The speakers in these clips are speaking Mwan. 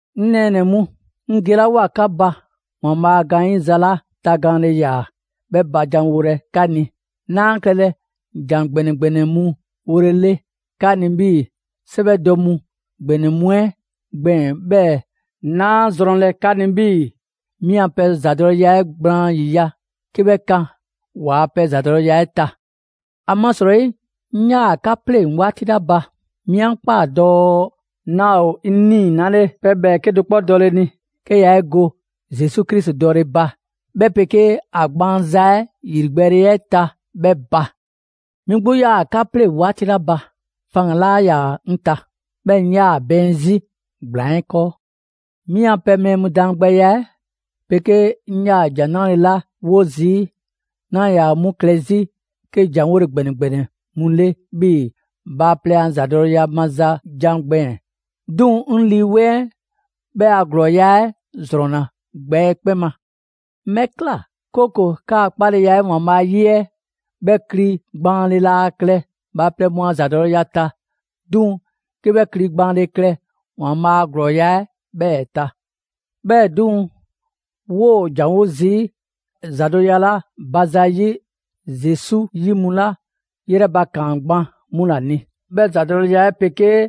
'Ŋ nɛɛnɛ‑ mu, 'ŋ gelawoa 'ka ba ‑Waanbhaa' a gaanyiza 'la tagaanle ‑yaa 'bhɛ ba janwolɛ 'ka ni, 'naa klɛlɛ ‑jan ‑gbɛnɛ ‑gbɛnɛ mu wolele 'ka ni 'bhii‑ 'sɛwɛdɔ mu ‑gbɛnɛ mu 'ɛ gbɛɛn‑, 'bhɛɛ‑ 'naa 'a zrɔnlɛ 'ka 'ni 'bhii‑ 'mi a pɛ ‑zadɔleya 'ɛ gblaan ‑yiya' 'ke 'bhɛ kan ‑waa' pɛ ‑zadɔleya 'ɛ ta. ‑Amasrɔyi, 'ŋ 'yaa‑ 'ka 'pleŋ‑ 'waati 'la ba, 'mi 'a ꞊kpaa dɔɔ 'naa ‑o 'ŋ 'nii‑ 'nale pɛ ‑bhɛɛke' do 'kpɔ dɔle ni, 'ke yaa 'e go Zesu Krisi dɔle ba, 'bhɛ 'pegee ‑a gbaanza 'ɛ ‑yrigbɛɛle 'ɛ ta 'bhɛ ba. 'Mi 'gbu 'yaa‑ 'ka 'pleŋ‑ 'waati 'la ba, faŋgan‑ 'laa ‑yaa 'ŋ ta, 'bhɛɛ‑ 'ŋ ꞊yaa bɛɛn 'zi ‑gblaan 'ɛ 'kɔɔ. 'Mi 'an pɛ mɛɛ mu daangbɛya 'ɛ 'pegee 'ŋ 'yaa‑ ‑Jan 'Nrale‑ 'la 'wo zii', 'naa ‑yaa 'mu klɛ 'zi 'ke ‑janwole ‑gbɛnɛ ‑gbɛnɛ mu 'le 'bhii‑ bhaaplɛŋ a ‑zadɔleya maza jan gbɛɛn‑, 'duŋ‑ 'ŋ Lii 'Weŋ 'ɛ 'bhɛ a ‑glɔɔya' 'ɛ ‑zrɔnna gbɛ 'ɛ 'kpɛn ma. 'Ŋ 'bhɛ ꞊kla, 'kooko‑ 'kaa‑ 'kpaleya 'ɛ ‑Waanbhaa' 'yi 'ɛ 'bhɛ kli gbaanle laa klɛ bhaaplɛŋ mu a ‑zadɔleya ta, 'duŋ‑ 'ke 'bhɛ kli gbaanle klɛ ‑Waanbhaa' a ‑glɔɔya' 'ɛ 'bhɛɛ‑ ta. 'Bhɛɛ‑ 'duŋ‑, 'woo‑ ‑janwo zii' ‑zadɔleya 'la ba zayi' Zesu 'yi mu 'la 'yrɛbakaan gban 'mu ‑la ni. 'Bhɛ ‑zadɔleya 'ɛ 'pegee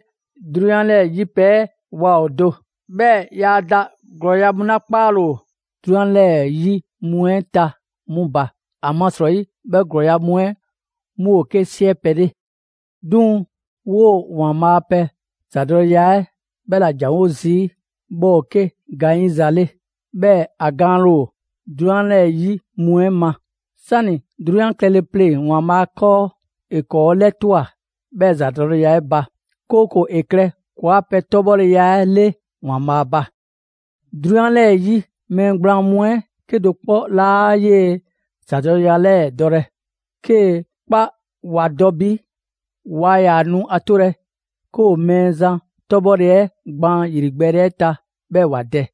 'drunyan 'lɛɛ‑ 'yi pɛ 'ɛ waa ‑o do, 'bhɛɛ‑ yaa da ‑glɔɔya' mu 'la 'kpaale‑ ‑o 'drunyan 'lɛɛ‑ 'yi mu 'ɛ ta 'mu ba. ‑Amasrɔyi 'bhɛ ‑glɔɔya' mu 'ɛ 'mu ‑o 'ke 'siɛ pɛ 'le. 'Duŋ‑ 'woo‑ ‑Waanbhaa' a pɛ ‑zadɔleya 'ɛ 'bhɛ ‑la ‑janwo' zii', 'bhɛ ‑o 'ke gaanyiza 'le; 'bhɛɛ‑ ‑a gaanle ‑o 'drunyan 'yi mu 'ɛ ma. 'Sani‑ 'drunyan klɛle pleŋ‑ ‑Waanbhaa' 'kɔɔ, ‑e ‑kɔɔ' 'lɛtwa꞊ 'bhɛɛ‑ ‑zadɔleya 'ɛ ba; 'kooko‑ ‑e klɛ ‑kɔɔa' pɛ 'tɔbhɔleya 'le ‑Waanbhaa' ba. 'Drunyan 'lɛɛ‑ 'yi mɛɛ gblaan mu 'ɛ 'kedo‑ 'kpɔ 'laa 'yee‑ ‑zadɔleya 'lɛɛ‑ dɔlɛ. 'Kee‑ 'kpa ‑wa dɔ bi, waa ‑yaa nu a 'tolɛ‑ 'ke ‑o Mɛɛzan 'tɔbhɔle 'ɛ gbaan ‑yrigbɛɛle 'ɛ ta 'bhɛɛ‑ ‑wa dɛ.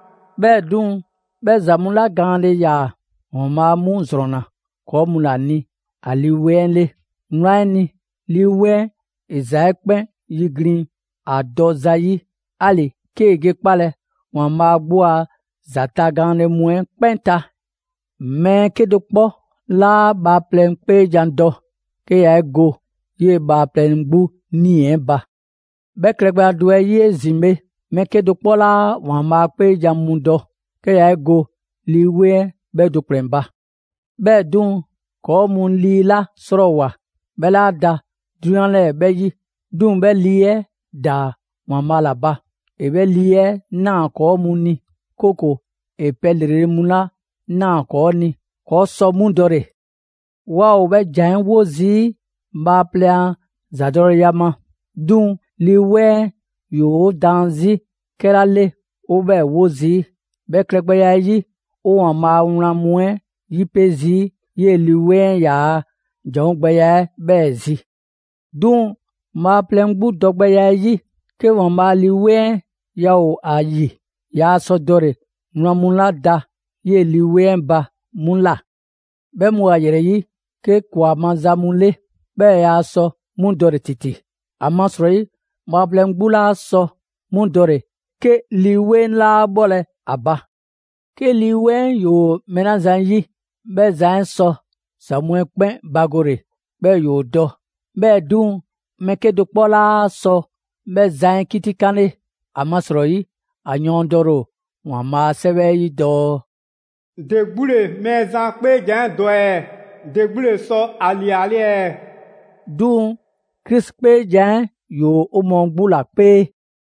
'Bhɛɛ‑ 'duŋ‑, 'bhɛ ‑za mu 'la gaanle ‑yaa, ‑Waanbhaa' 'mu ‑zrɔnna ‑kɔɔ' mu ‑la ni ‑a Lii 'Weŋ 'ɛ 'le. Wlan 'ɛ ni, Lii 'Weŋ 'ɛ ‑e ‑za 'ɛ 'kpɛn 'yiglin‑ ‑a dɔ zayi'; 'ali‑ 'kee‑ ge 'kpalɛ‑ ‑Waanbhaa' 'gbu a ‑za tagaanle mu 'ɛ 'kpɛn ta. Mɛɛ 'kedo‑ 'kpɔ 'laa bhaaplɛŋ 'kpeejan‑ dɔ, 'ke yaa 'e go 'yee‑ bhaaplɛŋ 'gbu 'nii‑ 'ɛ ba. 'Bhɛ klɛgbɛya do 'ɛ 'yi 'ezin‑ bhe, mɛɛ 'kedo‑ 'kpɔ 'laa ‑Waanbhaa' 'kpeejan‑ mu dɔ, 'ke yaa 'e go Lii 'Weŋ 'ɛ 'bhɛ do ‑kplɛn ba. 'Bhɛɛ‑ 'duŋ‑, ‑kɔɔ' mu Lii 'la 'srɔɔwoa‑, 'bhɛ 'laa da 'drunyan 'lɛɛ‑ 'bhɛ 'yi. 'Duŋ‑ 'bhɛ Lii 'ɛ ‑daa ‑Waanbhaa' ‑la ba. ‑E 'bhɛ Lii 'ɛ ꞊naa ‑kɔɔ' mu ni, 'kooko‑ ‑e pɛ ‑lrele' mu 'la ꞊naa ‑kɔɔ' ni, ‑kɔɔ' sɔ 'mu dɔle‑. 'Waa ‑o 'bhɛ ‑jan 'ɛ 'wo zii' bhaaplɛŋ a ‑zadɔleya ma; 'duŋ‑ Lii 'Weŋ 'ɛ ‑yoo' daan 'zi 'kɛla 'le 'o 'bhɛɛ‑ 'wo zii'. 'Bhɛ klɛgbɛya 'ɛ 'yi, 'o ‑Waanbhaa' a wlan mu 'ɛ 'yipe‑ zii' 'yee‑ Lii 'Weŋ 'ɛ ‑yaa' ‑janwo' gbɛya 'ɛ 'bhɛɛ‑ zi. 'Duŋ‑ bhaaplɛŋ 'gbu dɔgbɛya 'ɛ 'yi, 'ke ‑Waanbhaa' Lii 'Weŋ 'ɛ yaa ‑o ‑a ‑yi, yaa sɔ dɔle‑ wlan mu 'la da 'yee‑ Lii 'Weŋ ba 'mu ꞊la. 'Bhɛ mu ‑o ‑a ‑yrɛ 'yi 'ke ‑kwa maza mu 'le. 'Bhɛɛ‑ yaa sɔ 'mu dɔle‑ ‑titi, ‑amasrɔyi bhaaplɛŋ 'gbu 'laa sɔ 'mu dɔle‑ 'ke Lii 'Weŋ 'laa bhɔlɛ ‑a ba. 'Ke Lii 'Weŋ 'ɛ ‑yoo mɛɛ 'la zan 'yi, 'bhɛ zan 'ɛ sɔ ‑za mu 'ɛ 'kpɛn bagole, 'bhɛɛ‑ ‑yoo dɔ. 'Bhɛɛ‑ 'duŋ‑, mɛɛ 'kedo‑ 'kpɔ 'laa sɔ 'bhɛ zan 'ɛ 'kitikanle. ‑Amasrɔyi, ‑a yɔɔndɛle ‑o ‑Waanbhaa' a 'Sɛwɛ 'ɛ 'yi dɔɔ: «‑De 'gbu ‑le Mɛɛzan 'kpeejan‑ 'ɛ dɔ ɛɛ? ‑De 'gbu ‑le sɔ ‑a ‑liale' ɛɛ? 'Duŋ‑ Krisi 'kpeejan‑ 'ɛ ‑yoo 'o mɔɔ 'gbu ‑la 'kpee.»